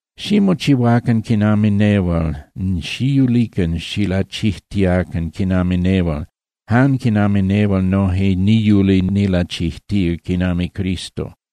Ximochihuacan quinami nehual, xiyulican xilachijtiacan quinami nehual, jan quinami nehual noje niyuli nilachijtía quinami Cristo.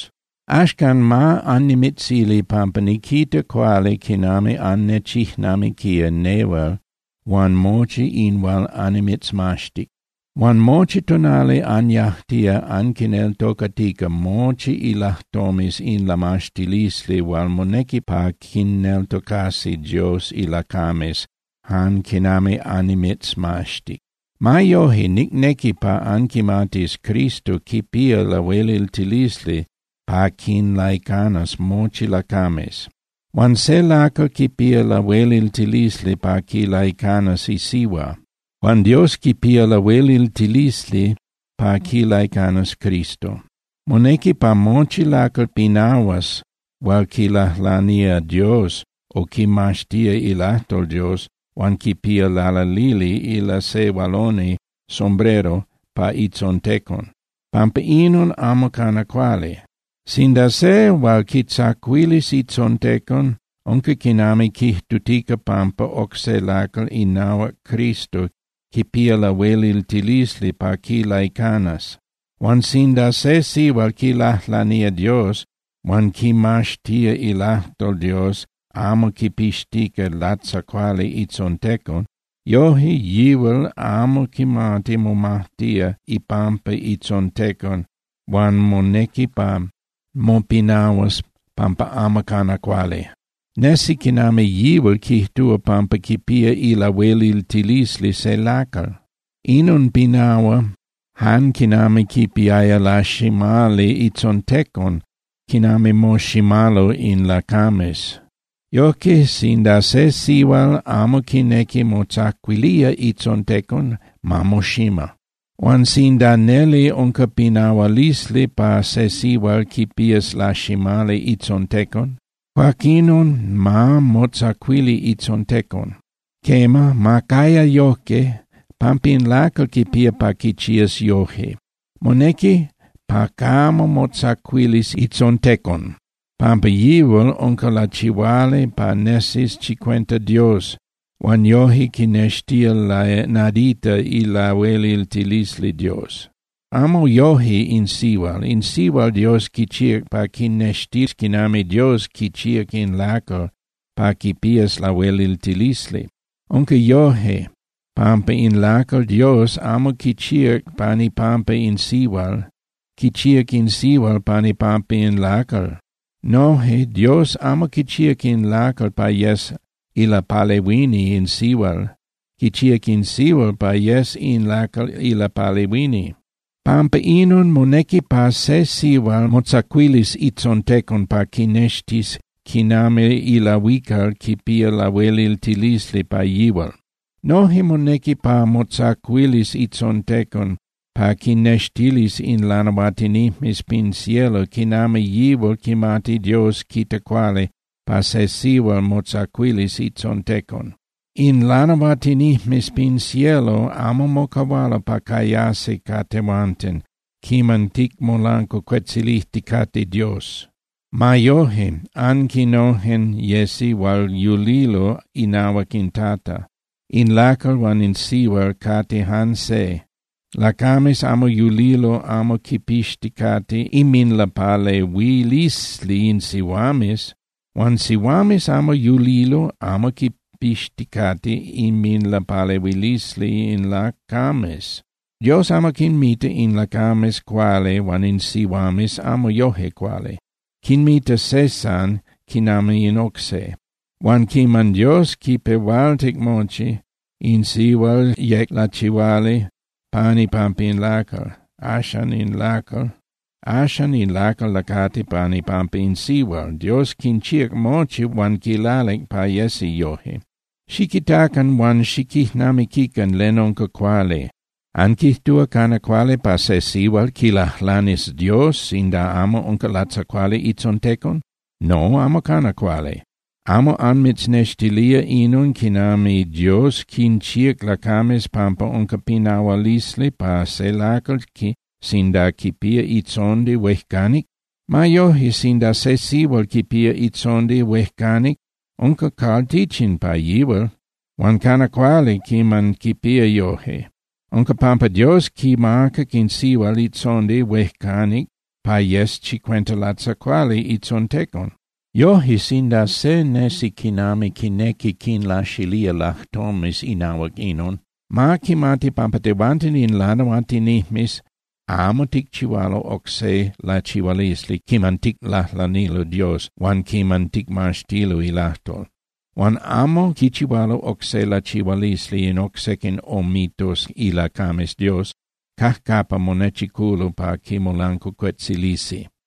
Axcan ma annimitzili pampa niquita cuali quinami annechijnamiquía nehual huan mochi in hual annimitzmaxtic. Huan mochi tonali anyajtía anquinneltocatica mochi ilajtomes in lamaxtilisli hual monequi pa quinneltocasi Dios ilacames jan quinami annimitzmaxtic. Ma yoje, nicnequi pa anquimatis Cristo quipía lahueliltilisli pa quinlaicanas mochi lacames. Huan se lacal quipía lahueliltilisli pa quilaicanas isihua, huan Dios quipía lahueliltilisli pa quilaicanas Cristo. Monequi pa mochi lacal pinahuas hual quilajlanía Dios o quimaxtía ilajtol Dios huan quipía lalalili ilasehualoni (sombrero) pa itzontecon, pampa inon amo cana cuali. Sinda se lacal quitzacuilis itzontecon, unca quinami quijtutica pampa oc se lacal inahuac Cristo quipía lahueliltilisli pa quilaicanas. Huan sinda se sihual quilajlanía Dios huan quimaxtía ilajtol Dios amo quipixtica latzacuali itzontecon, yoje yihual amo quimati momajtía ipampa itzontecon huan monequi pa mopinahuas pampa amo cana cuali. Nesi quinami yihual quijtúa pampa quipía ilahueliltilisli se lacal. Inon pinahua jan quinami quipiaya laximali itzontecon quinami moximalo in lacames. Yojque, sinda se sihual amo quinequi motzacuilía itzontecon, ma moxima. Huan sinda neli unca pinahualisli pa se sihual quipías laximali itzontecon, cuaquinon ma motzacuili itzontecon. Quema, ma caya yojque, pampa in lacal quipía pa quichías yoje. Monequi pa camo motzacuilis itzontecon, pampa yihual unca lachihuali pa nesis chicuenta Dios huan yoje quinextía nadita ilahueliltilisli Dios. Amo yoje in sihual. In sihual Dios quichíac pa quinextis quinami Dios quichíac in lacal pa quipías lahueliltilisli. Unca yojque, pampa in lacal Dios amo quichíac pan ipampa in sihual, quichíac in sihual pan ipampa in lacal. Noje Dios amo quichíac in lacal pa yes ilapalehuini in sihual, quichíac in sihual pa yes in lacal ilapalehuini. Pampa inon monequi pa se sihual motzacuilis itzontecon pa quinextis quinami ilahuical quipía lahueliltilisli pa yihual. Noje monequi pa motzacuilis itzontecon pa quinnextilis in lanahuatinijmes pin cielo quinami yihual quimati Dios quita cuali pa se sihual motzacuilis itzontecon. In lanahuatinijmes pin cielo amo mocahualo pa cayasi ca tehuanten quiman ticmolancuacuetzilijticate Dios. Ma yoje, aquinojen yesi hual yulilo inahuac in Tata, in lacal huan in sihual cate jan se, lacames amo yulilo amo quipixticate inminlapalehuilisli in sihuames, huan sihuames amo yulilo amo quipixticate inminlapalehuilisli in lacames. Dios amo quinmita in lacames cuali huan in sihuames amo yoje cuali. Quinmita se jan quinami in oc se. Huan quiman Dios quipehualtic mochi, in sihual yec lachihuali pan ipampa in lacal. Axan in lacal lacati pan ipampa in sihual. Dios quinchíac mochi huan quilalic pa yesi yoje. Xiquitacan huan xiquijnamiquican len unca cuali. ¿Anquijtúa cana cuali pa se sihual quilajlanis Dios sinda amo unca latzacuali itzontecon? No, amo cana cuali. ¿Amo anmitznextilía inon quinami Dios quinchíac lacames pampa unca pinahualisli pa se lacal sinda quipía itzondi huejcanic? Ma yoje, sinda se sihual quipía itzondi huejcanic, unca cualtichin pa yihual. Huan cana cuali quiman quipía yoje. Unca pampa Dios quimacac in sihual itzondi huejcanic pa yes chicuenta latzacuali itzontecon. Yoje, sinda se nesi quinami quinequi quinlaxilía lajtomes inahuac inon, ma quimati pampa tehuanten in lanahuatinijmes amo ticchihualo oc se lachihualisli quiman ticlajlanilo Dios huan quiman ticmaxtilo ilajtol. Huan amo quichihualo oc se lachihualisli in oc sequin omitos ilacames Dios cajcapa monechiculo pa quimolancuacuetzilisi.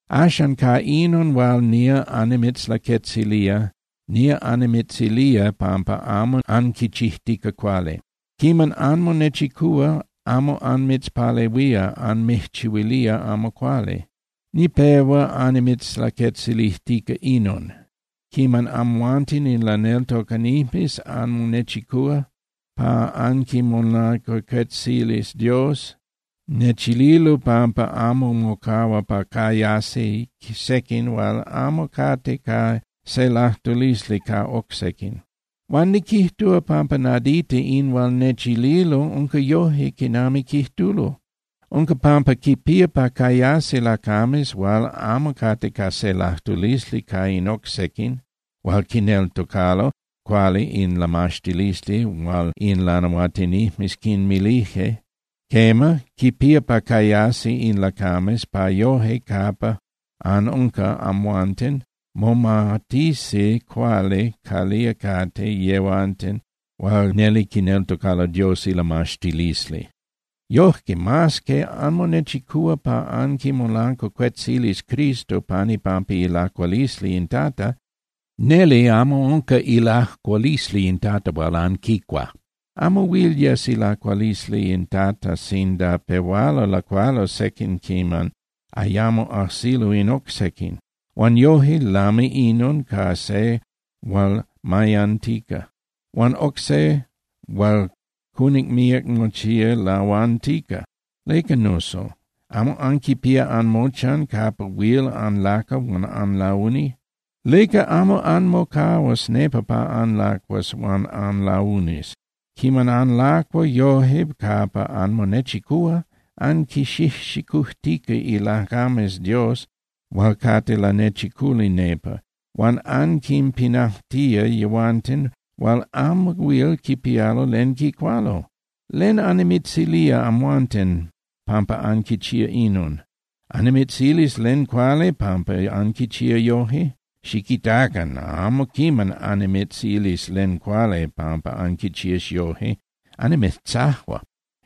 Axan, ca inon hual nía annimitzlaquetzilía, nía annimitzilía pampa amo anquichijtica cuali. Quiman anmonechicúa, amo anmitzpalehuía, anmijchihuilía amo cuali. Nipehua annimitzlaquetzilijtica inon: Quiman amhuanten in laneltocanijmes anmonechicúa pa anquimolancuacuetzilis Dios, nechililo pampa amo mocahua pa cayasi sequin hual amo cate ca se lajtulisli ca oc sequin. Huan niquijtúa pampa nadita in hual nechililo unca yoje quinami quijtulo. Unca pampa quipía pa cayasi lacames hual amo cate ca se lajtulisli ca in oc sequin hual quineltocalo cuali in lamaxtilisli hual in lanahuatinijmes quinmilije. Quema, quipía pa cayasi in lacames pa yoje capa anunca amhuanten momatisi cuali calía cate yehuanten hual neli quineltocalo Dios ilamaxtilisli. Yoje, mas que anmonechicúa pa anquimolancuacuetzilis Cristo pan ipampa ilacualisli in Tata, neli amo unca ilacualisli in Tata hual anquicua. Amo huil yes ilacualisli in Tata sinda pehualo lacualo sequin quiman ayamo ajsilo in oc sequin. Huan yoje, lami inon ca se hual mayantica, huan oc se hual cunic míac mochía lahuantica. ¿Leca, nuso? ¿Amo anquipía anmochan capa huil anlacua huan anlauni? ¿Leca amo anmocahuas nepa pa anlacuas huan anlaunis? Quiman anlacua yoje capa anmonechicúa, anquinxijxicujtica ilacames Dios hual cate lanechiculi nepa, huan anquinpinajtía yehuanten hual amo huil quipialo len quicualo. ¿Len annimitzilía amhuanten pampa anquichía inon? ¿Annimitzilis len cuali pampa anquichía yoje? ¡Xiquitacan! ¡Amo quiman annimitzilis len cuali pampa anquichía yoje, annimitzajua!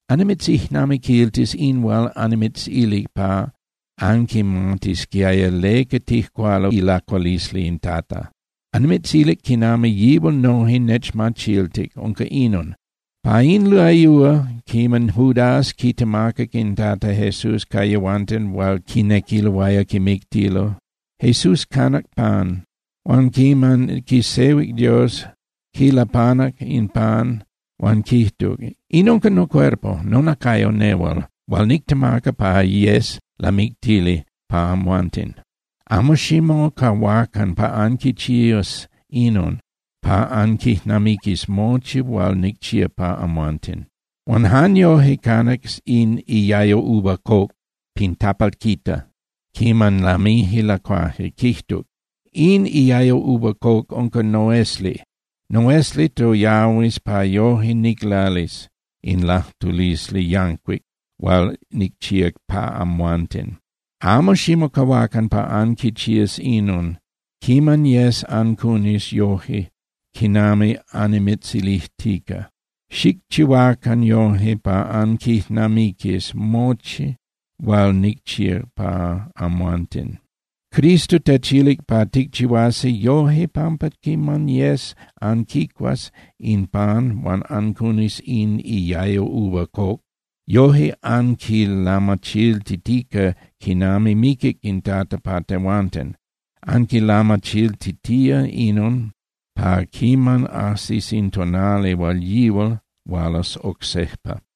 Annimitzijnamiquiltis in hual annimitzilic pa anquimatisquiaya leca tijcualo ilacualisli in Tata. Annimitzilic quinami yihual noje nechmachiltic, unca inon: Pa in layúa quiman Judas quitemacac in Tata Jesús ca yehuanten hual quinequiloaya quimictilo, Jesús canac pan. Huan quiman quisehuic Dios, quilapanac in pan huan quijtuc: “In unca nocuerpo (nonacayo) nehual hual nictemaca pa yes lamictili pa amhuanten. Amo ximocahuacan pa anquichías inon pa anquijnamiquis mochi hual nicchíac pa amhuanten.” Huan jan yoje canac in iayo uva coc pin tapalquita quiman lamije lacuaje, quijtuc: “In iayo uva coc unca noesli. Noesli toyahuis pa yoje niclalis in lajtulisli yancuic hual nicchía pa amhuanten. Amo ximocahuacan pa anquichías inon quiman yes ancunis yoje quinami annimitzilijtica. Xicchihuacan yoje pa anquijnamiquis mochi hual nicchíac pa amhuanten.” Cristo techilic pa ticchihuasi yoje pampa quiman yes anquicuas in pan huan ancunis in iayo uva coc, yoje anquilamachiltitica quinami miquic in Tata pa tehuanten. Anquilamachiltitía inon pa quiman ajsis in tonali hual yihual hualas oc sejpa.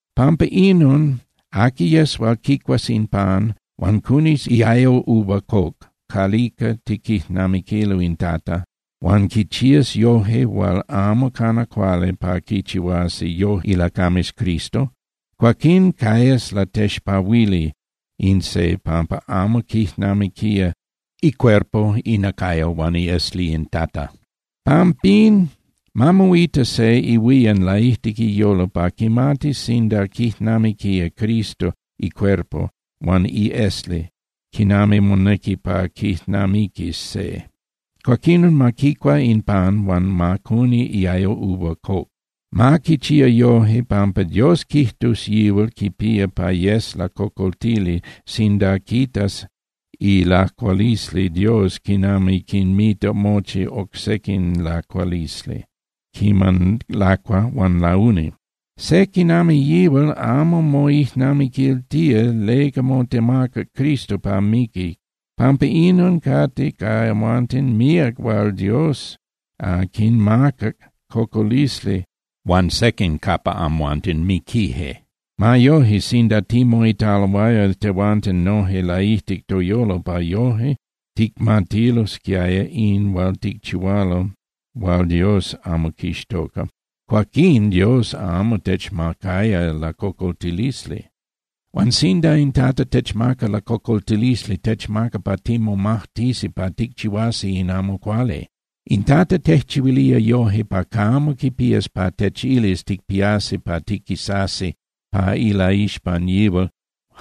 Pampa inon aqui yes hual quicuas in pan huan cunis iayo uva coc calica tiquijnamiquilo in Tata, huan quichías yoje hual amo cana cuali pa quichihuasi yoje ilacames Cristo, cuaquín cayas latexpahuili in se pampa amo quijnamiquía icuerpo (inacayo) huan iesli in Tata. Pampín, ma moita se ihuían laijtic iyolo pa quimatis sinda quijnamiquía Cristo icuerpo huan iesli quinami monequi pa quijnamiquis se. Cuaquinon ma quicua in pan huan ma cuni iayo uva coc. Ma quichía yoje pampa Dios quijtus yihual quipía pa yes lacocoltili sinda quitas ilacualisli Dios quinami quinmita mochi oc sequin lacualisli quiman lacua huan launi. Se quinami yihual amo moijnamiquiltía leca motemacac Cristo pa miquis. Pampa inon, cate ca amhuanten míac hual Dios quinmacac cocolisli huan sequin capa amhuanten miquije. Ma yoje, sinda timoitaloaya tehuanten noje laijtic toyolo pa yoje ticmatilosquiaya in hual ticchihualo hual Dios amo quixtoca, cuaquín Dios amo techmacaya lacocoltilisli. Huan sinda in Tata techmaca lacocoltilisli, techmaca pa timomajtisi pa ticchihuasi in amo cuali. In Tata tejchihuilía yoje pa camo quipías pa techilis ticpiasi pa tiquisasi pa ilaixpan yihual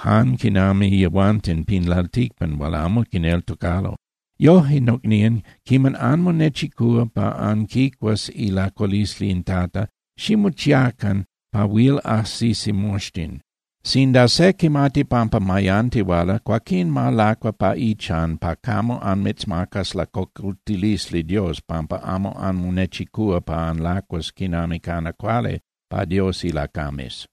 jan quinami yehuanten pin lalticpan hual amo quineltocalo. Yoje, nocnían, quiman anmonechicúa pa anquicuas ilacualisli in Tata, ximochiacan pa huil ajsisi moxtin. Sinda se quimati pampa mayantihuala, cuaquín ma lacua pa ichan pa camo anmitzmacas lacocoltilisli Dios pampa amo anmonechicúa pa anlacuas quinami cana cuali pa Dios ilacames.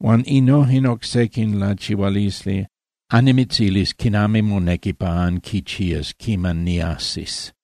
Huan innojen oc sequin lachihualisli, annimitzilis quinami monequi pa anquichías quiman niajsis.